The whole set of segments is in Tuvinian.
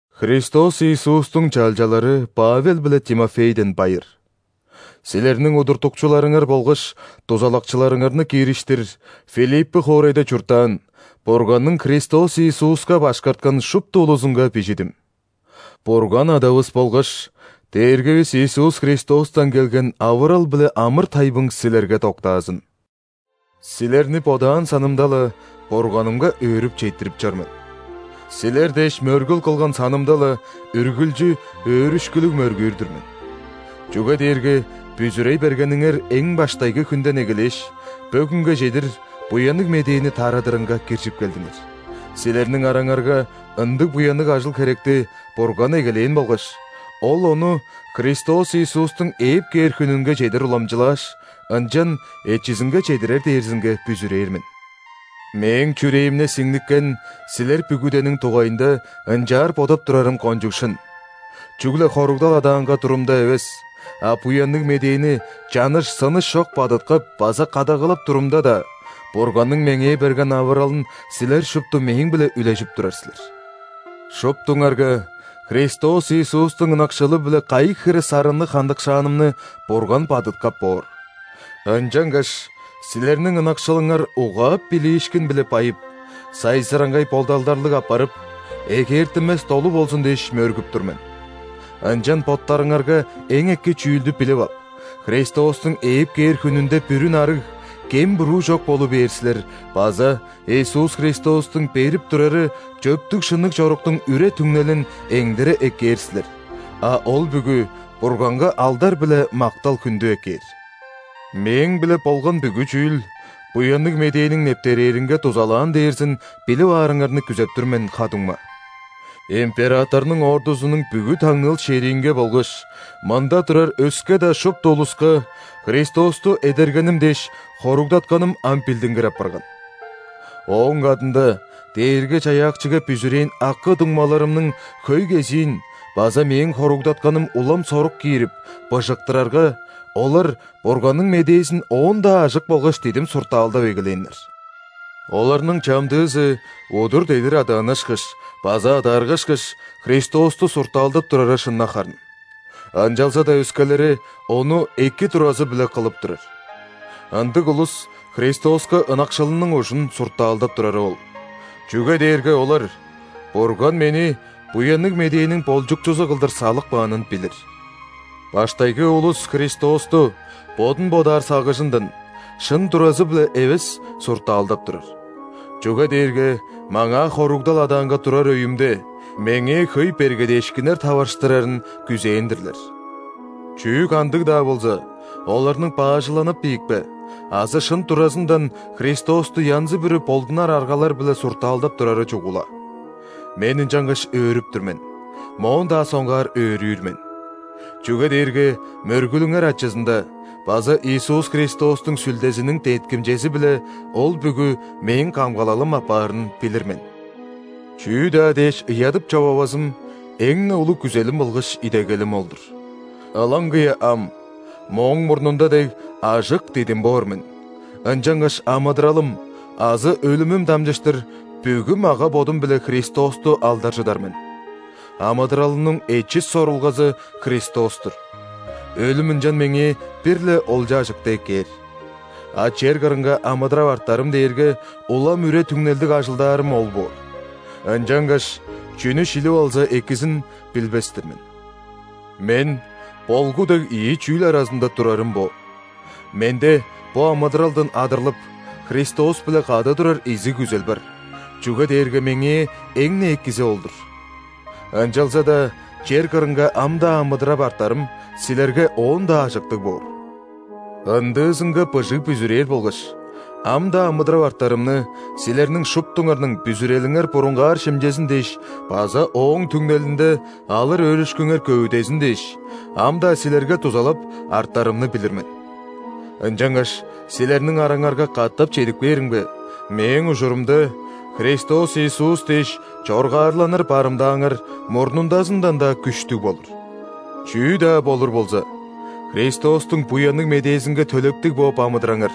Христос Иисустуң чалчалары Павел биле Тимофейден байыр. Силерниң удуртукчуларыңар болгаш дузалакчыларыңарны киириштир, Филиппы хоорайда чурттаан, Бурганның Христос Иисуска башкарткан шупту улузунга бижидим. Бурган Адавыс болгаш Дээргивис Иисус Христостан келген авырал биле амыр-тайбың силерге доктаазын! Силерни бодаан санымда-ла, Бурганымга өөрүп четтирип чор мен. Силер дээш мөргүл кылган санымда-ла, үргүлчү өөрүшкүлүг мөргүүр-дүр мен. Чүге дээрге бүзүрей бергениңер эң баштайгы хүнден эгелээш, бөгүнге чедир Буянныг Медээни тарадырынга киржип келдиңер. Силерниң араңарга ындыг буянныг ажыл-херекти Бурган эгелээн болгаш, Ол ону Христос Иисустуң ээп кээр хүнүнге чедир уламчылааш, ынчан эчизинге чедирер дээрзинге бүзүрээр мен. Мээң чүрээмде сиңниккен силер бүгүдениң дугайында ынчаар бодап турарым кончуг шын – чүгле хоругдал адаанга турумда эвес, а Буянныг Медээни чаныш-сыныш чок бадыткап база кадагалап турумда-даа, Бурганның меңээ берген авыралын силер шупту мээң-биле үлежип турар силер. Шуптуңарга Христос Иисустуң ынакшылы-биле кайы хире сарынныг хандыкшаанымны Бурган бадыткап боор! Ынчангаш силерниң ынакшылыңар угаап билиишкин-биле байып, сайзыраңгай бодалдарлыг апарып, эгээртинмес долу болзун дээш, мөргүп тур мен. Ынчан боттарыңарга эң эки чүүлдү билип ап, Христостуң ээп кээр хүнүнде бүрүн арыг, кем-буруу чок болу бээр силер база Иисус Христостуң берип турары чөптүг-шынныг чоруктуң үре-түңнелин эңдере эккээр силер, а ол бүгү Бурганга алдар биле мактал-хүндү эккээр. Мээң-биле болган бүгү чүүл Буянныг Медээниң нептерээринге дузалаан дээрзин билип аарыңарны күзеп тур мен, ха-дуңма. Императорнуң ордузунуң бүгү таңныыл шериинге болгаш мында турар өске-даа шупту улуска Христосту эдергеним дээш хоругдатканым ам билдингир апарган. Ооң кадында Дээрги-Чаяакчыга бүзүрээн акы-дуңмаларымның хөй кезиин база мээң хоругдатканым улам сорук киирип, быжыктырарга, олар Бурганның медээзин оон-даа ажык болгаш дидим суртаалдап эгелээннер. Оларның чамдыызы удур-дедир адааннашкаш база адааргашкаш, Христосту суртаалдап турары шын-на харын. Ынчалза-даа өскелери ону эки туразы-биле кылып турар. Ындыг улус Христоска ынакшылының ужун суртаалдап турары ол, чүге дээрге олар Бурган мени Буянныг Медээниң болчукчузу кылдыр салып каанын билир. Баштайгы улус Христосту бодун бодаар сагыжындан, шын туразы-биле эвес суртаалдап турар, чүге дээрге маңаа хоругдал адаанга турар өйүмде, меңээ хөй бергедээшкиннер таварыштырарын күзээн-дирлер. Чүү-кандыг-даа болза, оларның баажыланып ийикпе, азы шын туразындан Христосту янзы-бүрү болдунар аргалар-биле суртаалдап турары чугула. Мен ынчангаш өөрүп тур мен, моон-даа соңгаар өөрүүр мен. Чүге дээрге мөргүлүңер ачызында база Иисус Христостуң Сүлдезиниң деткимчези-биле ол бүгү мээң камгалалым апаарын билир мен. Чүү-даа дээш ыядып-човавазым – эң-не улуг күзелим болгаш идегелим ол-дур. Ылаңгыя ам, мооң мурнунда дег, ажык, дидим боор мен, ынчангаш амыдыралым азы өлүмүм дамчыштыр, бүгү мага-бодум-биле Христосту алдаржыдар мен. Амыдыралымның эчис сорулгазы – Христос-тур, өлүм ынчан меңээ бир-ле олча-ажыкты эккээр. А чер кырынга амыдырап артарым дээрге улам үре-түңнелдиг ажылдаарым ол боор. Ынчангаш чүнү шилип алза экизин билбес-тир мен. Мен болгу дег ийи чүүл аразында турарым бо: менде бо амыдыралдан адырлып, Христос-биле кады турар изиг күзел бар, чүге дээрге меңээ эң-не экизи ол-дур. Ынчалза-даа чер кырынга ам-даа амыдырап артарым силерге оон-даа ажыктыг боор. Ындыызынга быжыг бүзүрээр болгаш, ам-даа амыдырап артарымны, силерниң шуптуңарның бүзүрелиңер бурунгаар шимчезин дээш база ооң түңнелинде алыр өөрүшкүңер көвүдезин дээш, ам-даа силерге дузалап артарымны билир мен. Ынчангаш, силерниң араңарга катап чедип кээримге, мээң ужурумда Христос Иисус дээш чоргаарланыр барымдааңар мурнундазындан-даа күштүг болур. Чүү-даа болур болза, Христостуң Буянныг Медээзинге төлептиг бооп амыдыраңар.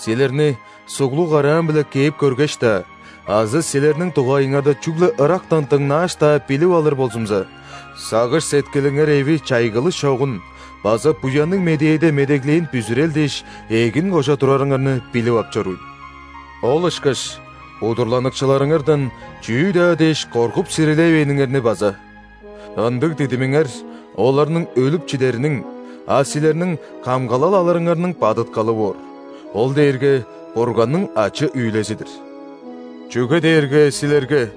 Силерни суглуг караам-биле кээп көргеш-даа азы силерниң дугайыңарда чүгле ырактан дыңнааш-даа билип алыр болзумза, сагыш-сеткилиңер эви чайгылыш чогун база Буянныг Медээде медеглээн бүзүрел дээш эгин кожа турарыңарны билип ап чорууйн. Ол ышкаш удурланыкчыларыңардан чүү-даа дээш коргуп сирилевээниңерни база. Ындыг дидимиңер оларның өлүп чидериниң, а силерниң камгалал алырыңарның бадыткалы боор – ол дээрге Бурганның ачы-үүлези-дир. Чүге дээрге силерге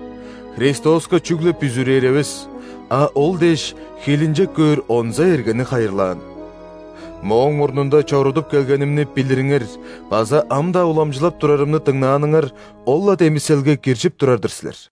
Христоска чүгле бүзүрээр эвес, а Ол дээш хилинчек көөр онза эргени хайырлаан. Мооң мурнунда чорудуп келгенимни билириңер база ам-даа уламчылап турарымны дыңнааныңар ол-ла демиселге киржип турар-дыр силер.